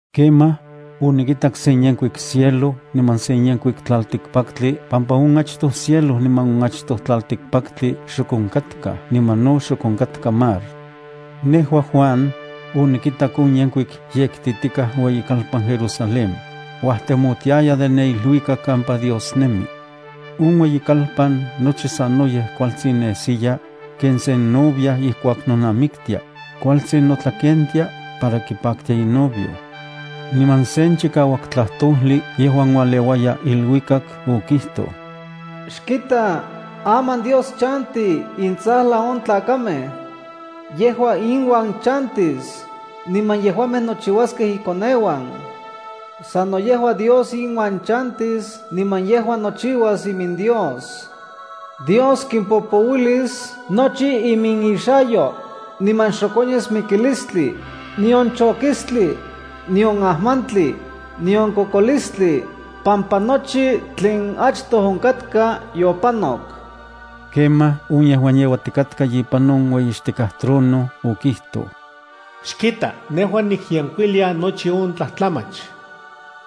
Kemaj, onikitak sen yenkuik cielo niman se yenkuik tlaltikpaktli pampa on achtoj cielo niman on achtoj tlaltikpaktli xok onkatkaj niman no xok onkatka mar. Nejua, Juan, onikitak on yenkuik yektitikaj ueyikalpan Jerusalén, uajtemotiaya de ne iluikak kampa Dios nemi. On ueyikalpan nochi sanoyej kualtsin nesiya, ken sen novia ijkuak nonamiktia, kualtsin notlakentia para kipaktia inovio. Niman sen chikauak tlajtojli yejuan ualeuaya iluikak, okijtoj: “Xkita, aman Dios chanti intsajlan on tlakamej. Yejua inuan chantis, niman yejuamej nochiuaskej ikoneuan. Sano yejua Dios inuan chantis niman yejua nochiuas iminDios. Dios kimpopouilis nochi iminixayo, niman xok onyas mikilistli, nion chokistli, nion ajmantli, nion kokolistli, pampa nochi tlen achtoj onkatka yopanok.” Kemaj on yejuan yeuatikatka ipan on ueyixtikaj trono okijtoj: “Xkita, nejua nikyenkuilia nochi on tlajtlamach.”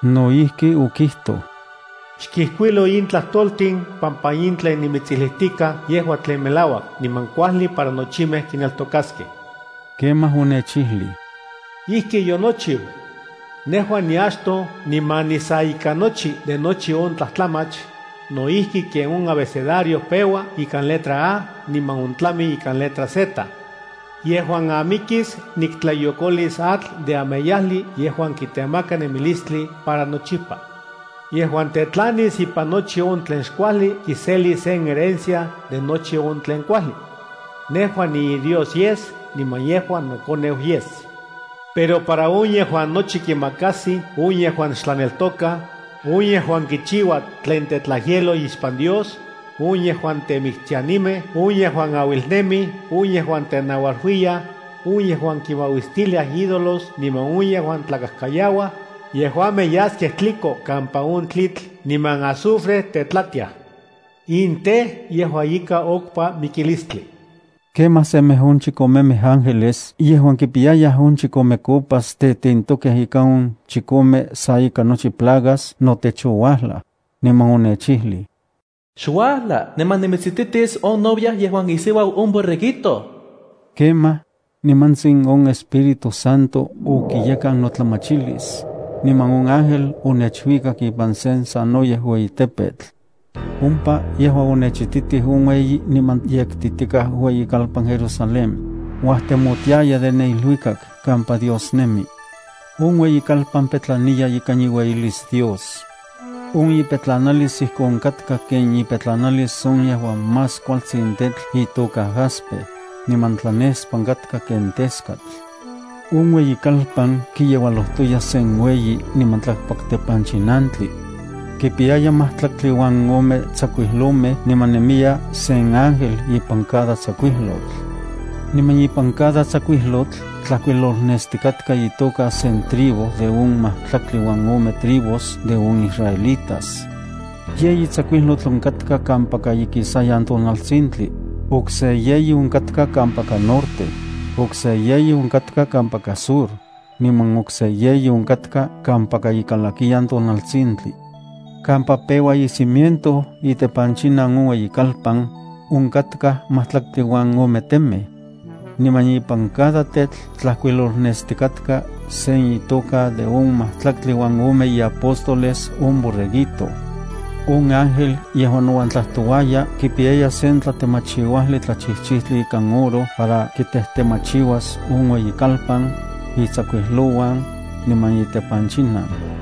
No ijki okijtoj: “Xkijkuilo in tlajtoltin pampa in tlen nimitsijlijtikaj yejua tlen melauak niman kuajli para nochimej kineltokaskej.” Kemaj onechijlij: “Ijki yonochiu. Nejua niachtoj niman nisa ika nochi de nochi on tlajtlamach, no ijki ken on abecedario peua ikan letra A niman ontlami ikan letra Z. Yejuan amikis, niktlayokolis atl de ameyajli yejuan kitemaka nemilistli para nochipa. Yejuan tetlanis ipan nochi on tlen xkuajli kiselis sen herencia de nochi on tlen kuajli. Nejua niiDios yes, niman yejua nokoneu yes. Pero para on yejuan nochi kimakajsij, on yejuan xtlaneltokaj, on yejuan kichiuaj tlen tetlajyeloj ixpan Dios, on yejuan temiktianimej, on yejuan auilnemij, on yejuan tenaualuiyaj, on yejuan kinmauistiliaj ídolos niman on yejuan tlakajkayauaj, yejuamej yaskej tliko kampa on tlitl niman azufre tetlatiaj. In tej, yejua ika okpa mikilistli.” Kemaj semej on chikomemej ángeles yejuan kipiyayaj on chikome copas tetentokej ikan on chikome sa ika nochi plagas notech ouajlaj, niman onechijlij: “Xuajla, niman nimitsititis on novia yejuan isiuau on Borreguito.” Kemaj, nimantsin on Espíritu Santo okiyekan notlamachilis, niman on ángel onechuikak ipan sen sanoyej ueyi tepetl. Ompa yejua onechititij on ueyi niman yektitikaj ueyikalpan Jerusalén, uajtemotiaya de ne iluikak kampa Dios nemi. On ueyikalpan petlaniya ikan iueyilis Dios. On ipetlanalis ijkon katka ken ipetlanalis on yejuan más kualtsin tetl itoka jaspe, niman tlanespan katka ken teskatl. On ueyikalpan kiyeualojtoya sen ueyi niman tlakpak tepanchinantli. Kipiyaya majtlaktli uan ome tsakuijlomej niman nemiya sen ángel ipan cada tsakuijlotl. Niman ipan cada tsakuijlotl tlajkuilolnestikatka itoka sen tribu de on majtlaktli uan ome tribus de on israelitas. Yeyi tsakuijlotl onkatka kampaka ikisayan tonaltsintli, okse yeyi onkatka kampaka norte, okse yeyi onkatka kampaka sur, niman okse yeyi onkatka kampaka ikalakiyan tonaltsintli. Kampa peua icimiento itepanchinan on ueyikalpan, onkatkaj majtlaktli uan ome temej. Niman ipan cada tetl tlajkuilolnestikatka sen itoka de on majtlaktli uan ome iapóstoles on Borreguito. On ángel yejuan nouan tlajtouaya kipiyaya sen tlatemachiuajli tlachijchijtli ikan oro para kitejtemachiuas on ueyikalpan, itsakuijlouan, niman itepanchinan.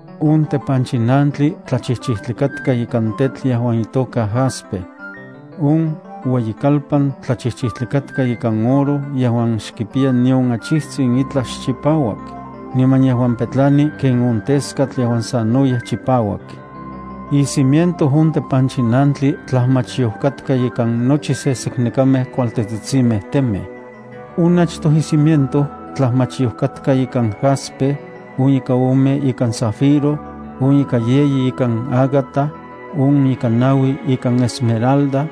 On tepanchinantli tlachijchijtli katka ikan tetl yejuan itoka jaspe. On ueyikalpan tlachijchijtli katka ikan oro yejuan xkipiya nion achijtsin itlaj xchipauak, niman yejuan petlani ken on teskatl yejuan sanoyej chipauak. Icimiento on tepanchinantli tlajmachyoj katka ikan nochi seseknekamej kualtetsitsinmej temej. On achtoj icimiento tlajmachyoj katka ikan jaspe, on ika ome ikan zafiro, on ika yeyi ikan ágata, on ika naui ikan esmeralda,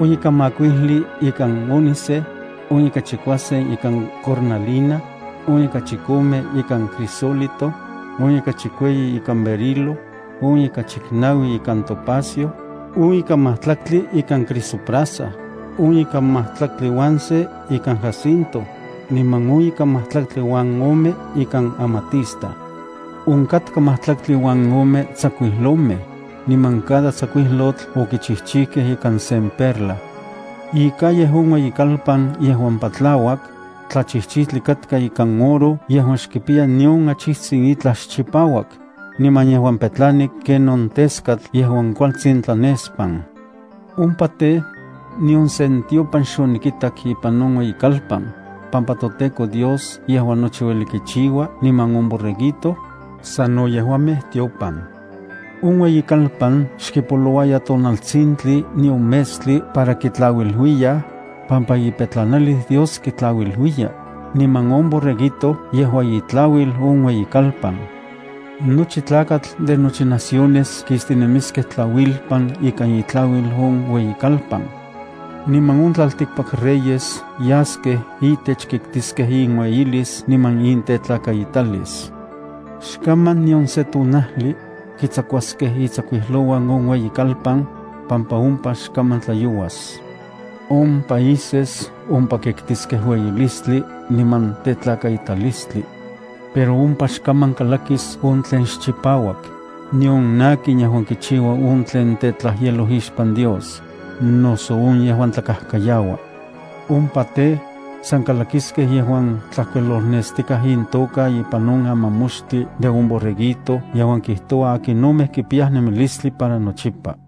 on ika makuijli ikan ónike, on ika chikuasen ikan cornalina, on ika chikome ikan crisólito, on ika chikueyi ikan berilo, on ika chiknaui ikan topacio, on ika majtlaktli ikan crisoprasa, on ika majtlaktli uan sen ika jacinto, niman on ika majtlaktli uan ome ikan amatista. Onkatka majtlaktli uan ome tsakuijlomej, niman cada tsakuijlotl okichijchijkej ikan sen perla. Icalle on ueyikalpan yejuan patlauak, tlachijchijtli katka ikan oro yejuan xkipiya nion achijtsin itlaj xchipauak, niman yejuan petlani ken on teskatl yejuan kualtsin tlanespan. Ompa tej, nion sen tiopan xonikitak ipan on ueyikalpan, pampa toTEKO Dios yejuan nochi ueli kichiua niman on Borreguito, sano yejuamej tiopan. On ueyikalpan xkipoloua tonaltsintli nion metstli para kitlauiluiyaj, pampa iueyilis Dios kitlauiluiya, niman on Borreguito yejua itlauil on ueyikalpan. Nochi tlakatl de nochi naciones kistinemiskej tlauilpan ikan itlauil on ueyikalpan. Niman on tlaltikpak reyes yaskej itech kitkiskej inueyilis niman intetlakaitalis. Xkaman nion se tonajli, kitsakuaskej itsakuijlouan on ueyikalpan, pampa ompa xkaman tlayouas. On países ompa kiktiskej ueyilistli niman tetlakaitalistli. Pero ompa xkaman kalakis on tlen xchipauak, nion akin yejuan kichiua on tlen tetlajyeloj ixpan Dios, noso on yejuan tlakajkayaua. Ompa tej, san kalakiskej yejuan tlajkuilolnestikaj intoka ipan on amamoxtli de on Borreguito yejuan kijtoua akinomej kipiyaj nemilistli para nochipa.